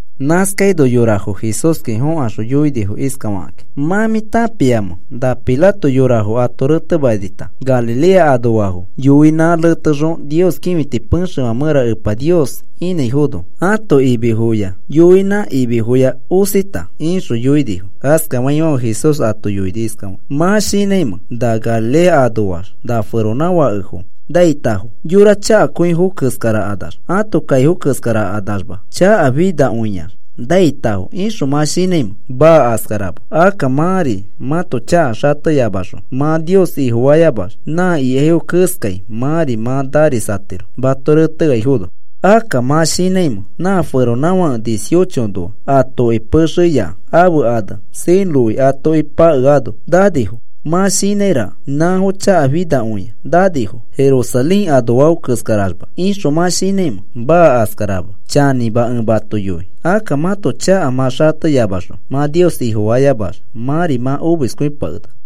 Nãskaino yorafo Jesúski fokaxõ yoinifo iskafakĩ: “¿Mã mĩ tãpiamẽ na Pilato yorafo ato retemanita Galilea anoafo yoinã retekaxõ Nios kĩfiti pexefã mẽraxõ Epa Nios inãifono ãto imifo yoinãnã imifoya osita?” ixõ yoinifo. Askafaifãfe Jesús ato yoini iskafakĩ: “¿Mã shinãimẽ na Galilea anoax na feronãfakefo naitafo? ¿Yora chakakõifo keskarakanax ãto kaifo keskarakanaxma chakafinakõiax naitafo ixõ mã shinãimẽ? Maa. Askarama. Akka mãri mãto chaka xateyamaxõ mã Nios Ifofayamax nã ikaifo keskai mãri mã narisatiro mato reteaifono. ¿Akka mã shinãimẽ nã feronãfake dieciochonoa atoki pexe keya ãfe ane Siloé atoki pakeano nanifo? ¿Mã shinãiraka: ‘Nãfo chakafinakõia nanifo Jerusalén anoafo keskaraxma,’ ixõ mã shinãimẽ? Maa. Askarama. Chanĩma ẽ mato yoi. Akka mãto chaka mã xateyamaxõ mã Nios Ifofayamax, mãri mã omiskõipakenaka.”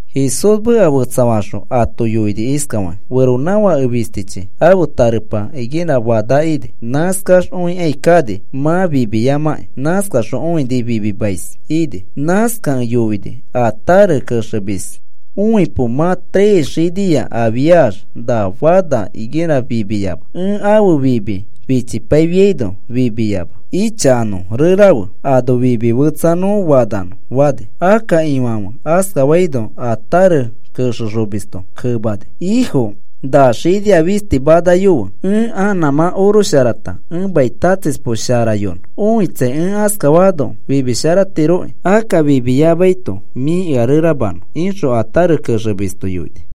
Jesús meka fetsafaxõ ato yoini iskafakĩ: “Feronãfake fistichi ãfe tarepa higuera fana ini. Nãskax õikai kani mã fimiyamãkĩ, kaxõ õini fimimais ini. Nãskakẽ yoini a tare kexemis. ‘Õipo mã tres xinia afiax na fana higuera fimiyama. Ẽ ãfe fimi fichipaifiaino fimiyama. Ichakanõ rerafe, ano fimi fetsa nõ fananõ,’ fani. “Akka ifãfe askafaino a tare kexexomisto kemani: ‘Ifo, na xinia fisti manayofe. Ẽ a nãmã orosharata ẽ mai tatsispo sharayonõ. Õitsai, ẽ askafaano fimisharatirokĩ. Akka fimiyamaito mĩ ea reramanõ,’ ixõ a tare kexemisto yoini.”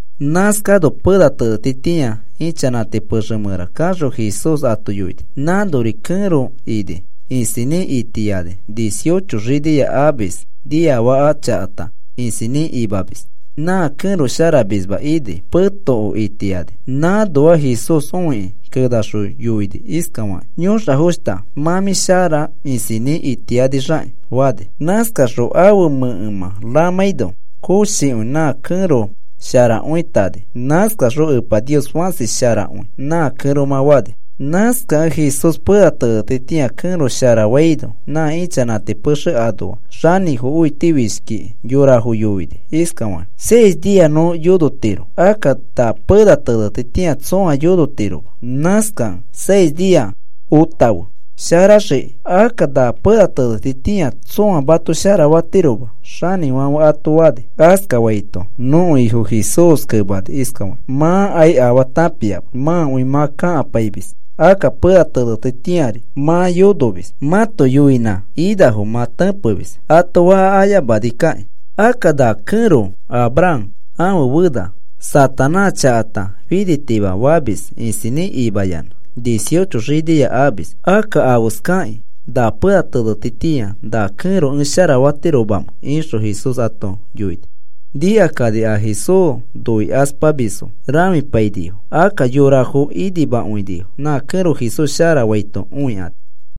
Nãskano pena tenetitĩa ichanãti pexe mẽra kaxõ Jesús ato yoini. Nãnori kẽro ini isinĩ itiani dieciocho xinia amis, niafaka chakata isinĩ imamis nã kẽro sharamisma ini petoko itiani. Nãnoa Jesús õikĩ kenaxõ yoini iskafakĩ: “Yõxafoshta, mã mĩ shara isinĩ itiyanixakĩ,” fani. Nãskaxõ ãfe mẽkemã ramãino, koshikõi nã kẽro sharakõitani. Nãskaxõ, “Epa Nios fãsi sharakõi,” nã kẽromã fani. Nãskakẽ Jesús pena tenetitĩa kẽro sharafaino, nã ichanãti pexe anoa xanĩfo õitifishkikĩ yorafo yoini iskafakĩ: “Seis nia nõ yonotiro, akka na pena tenetitĩa tsõa yonotiroma. Nãskakẽ seis nia otafe sharaxiki, akka na pena tenetitĩa tsõa mato sharafatiroma,” xanĩfãfe ato fani. Askafaito nõko Ifo Jesús kemani iskafakĩ: “Mãkai afaa tãpiama, mãkõi mã kakapaimis, akka pena tenetitĩari mã yonomis mãto yoinã inafo mã tẽpemis ato faka ayamanikakĩ. Akka na kẽro Abraham ãfe fena Satanás chakata finitima famis isinĩ imayanã dieciocho xinia amamis. ¿Akka afeskakĩ na pena tenetitĩa na kẽro ẽ sharafatiromamẽ?” ixõ Jesús ato yoini. Nikakani a Jesús noikaspamisfo rãfipainifo. Akka yorafo inimakõinifo nã kẽro Jesús sharafaito õikani.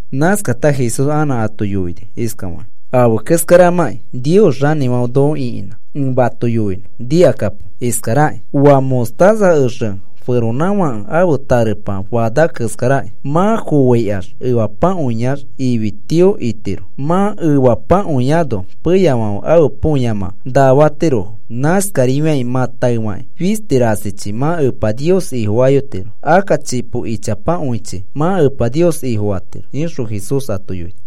Nãskata Jesús anã ato yoini iskafakĩ: “Afe keskaramakĩ Nios xanĩfãfe noko ĩkinã ẽ mato yoinõ. Nikakapo iskarakĩ: Oa mostaza exe feronãfãke ãfe tarepa fana keskarakĩ. Mã foaikax efapakõiax ifi tio itiro. Mã efepakõiano peyafãfe ãfe põyamã naa fatirofo. Nãskarifiakĩ mã taefakĩ fisti rasichi mã Epa Nios Ifofayotiro. Akka chipo ichapakõichi mã Epa Nios Ifofatiro,” ixõ Jesús ato yoini.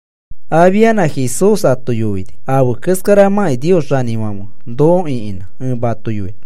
Afianã Jesús ato yoini: “Afe keskaramakĩ Nios xanĩfãfe noko ĩkinã ẽ mato yoinõ.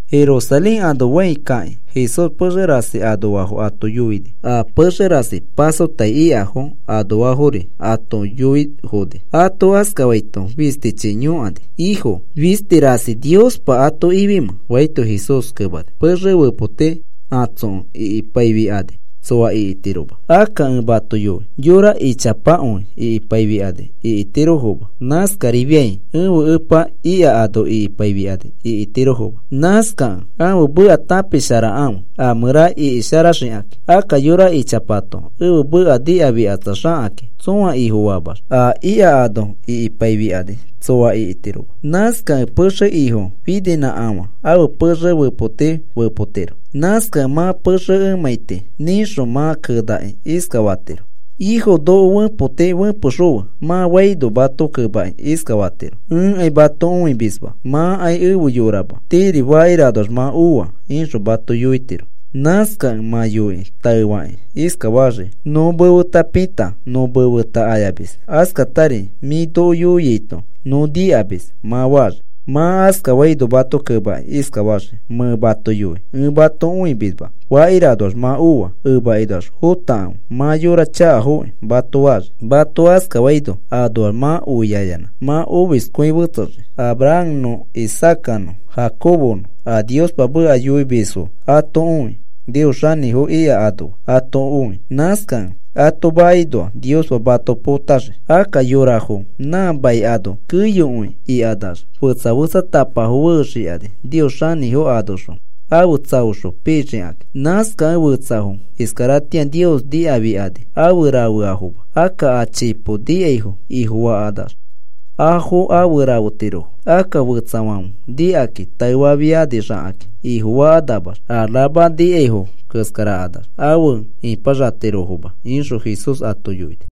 Jerusalén ano fãi kakĩ, Jesús pexe rasi anoafo ato yoini a pexe rasi pasotai ikafo anoafori ato yoifoni. Ato askafaito fistichi yõkani: “Ifo, ¿fisti rasi Niospa ato ifimẽ?” faito Jesús kemani, “Pexe fepoti atsokẽ ikipaifikani tsoa ikitiroma. Akka ẽ mato yoi yora ichapakõi ikipaifikani ikitirofo. Nãskarifiai ẽfe Epa ika ano ikipaifikani ikitirofoma. Nãskakẽ ãfe meka tãpisharakãfe a mẽra ikisharaxikakĩ. Akka yora ichapato ẽfe Epa nikafikatsaxakakĩ, tsõa Ifofamax a ika ano ikipaifikani tsoa ikitiroma. Nãskakẽ pexe ifo fininãkafã ãfe pexe fepoti fepotiro. Nãskakẽ mã pexe emãiti nĩxõ mã kenakĩ iskafatiro: ‘Ifo, noko fepoti fepexõfe,’ mã faino mato kemakĩ iskafatiro: ‘Ẽkai mato õimisma mãkai efe yorama tiiri fakiranoax mã oa,’ ixõ mato yoitiro. “Nãskakẽ mã yoikĩ taefakĩ iskafaxii: ‘Nõ mefeta pita nõ mefeta ayamis, askatari mĩ noko yoiaito nõ nikamis,’ mã faxii. “Mã askafaino mato kemakĩ iskafaxii: ‘Mẽ mato yoi ẽ mato õimisma fakiranoax mã oa. Emakinoax fotakãfe mã yora chakafo mato faxii.’ Mato askafaino anoax mã oiayanã mã omiskõi fetsexii, Abrahamnõ Isaacanõ Jacobonõ a Niospa meka yoimisfonõ ato õi Nios xanĩfo ika anoa ato õi. Nãskakẽ ato makinoa Niospa mato potaxii. Akka yorafo nã mai ano keyokõi ikanax fetsa fetsatapafo fexikani Nios xanĩfo anoxõ afe tsaoxõ pixikakĩ. Nãskakẽ fetsafo iskaratĩa Nios nikafikani afe rafeafoma, akka a chipo nikaifo Ifofakanax afo afe rafetirofo. Akka fetsafãfe nikakĩ taefafianixakakĩ Ifofakanamax a rama nikaifo keskarakanax afe ipaxatirofoma,” ixõ Jesús ato yoini.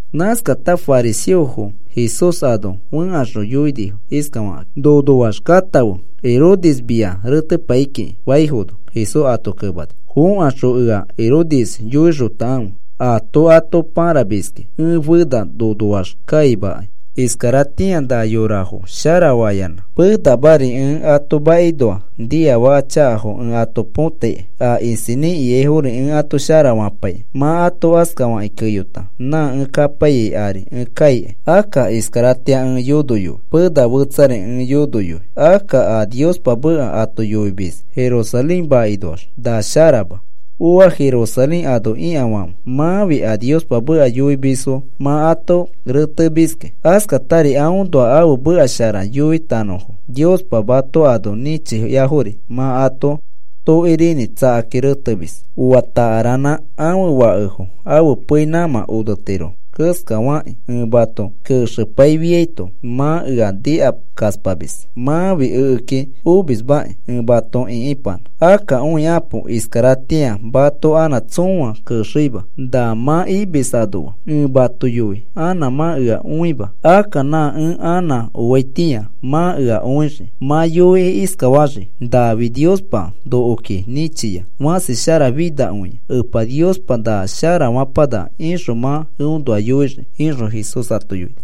Nãskata fariseofo Jesús ano fẽkaxõ yoinifo iskafakakĩ: “Nonoax katãfe Herodes mia retepai kiki,” faifono, Jesús ato kemani: “Fokaxõ ea Herodes yoixotakãfe aato ato pãramiski. Ẽ fena nonoax kaimakai. Iskaratĩa na yorafo sharafayanã penamari ẽ ato makinoa niafaka chakafo ẽ ato põtaikai. A isinĩ ikaifori ẽ ato sharafapaikai. Mã ato askafakĩ keyota nã ẽ kapaiyai ari ẽ kaikai. Akka iskaratĩa ẽ yonoyoi, pena fetsari ẽ yonoi, akka a Niospa meka ato yoimis Jerusalén makinoax na sharama. “¡Ooa Jerusalén ano ikafãfe! Mãfi a Niospa meka yoimisfo mã ato retemiski. Askatari aõnoa ãfe meka shara yoitanõfo Niospa mato ano nĩchiafori mã ato tokorinĩ tsakakĩ retemis. Oa takaranã ãfe fakefo ãfe pei nãmã onetiro keskafakĩ ẽ mato kexepaifiaito mã ea nikakaspamis. Mãfi ekeki omismakĩ ẽ mato ĩkipanã. Akka õikapo, iskaratĩa mato anã tsõa kexeima na mã imis anoa. Ẽ mato yoi anã mã ea õima. Akka nã ẽ anã oiaitĩa mã ea õixii. Mã yoikĩ iskafaxii: ‘Nafi Niospa nokoki nĩchia fãsi sharafinakõia Epa Niospa na shara fapanaka,’ ixõ mã eõnoa yoixii,” ixõ Jesús ato yoini.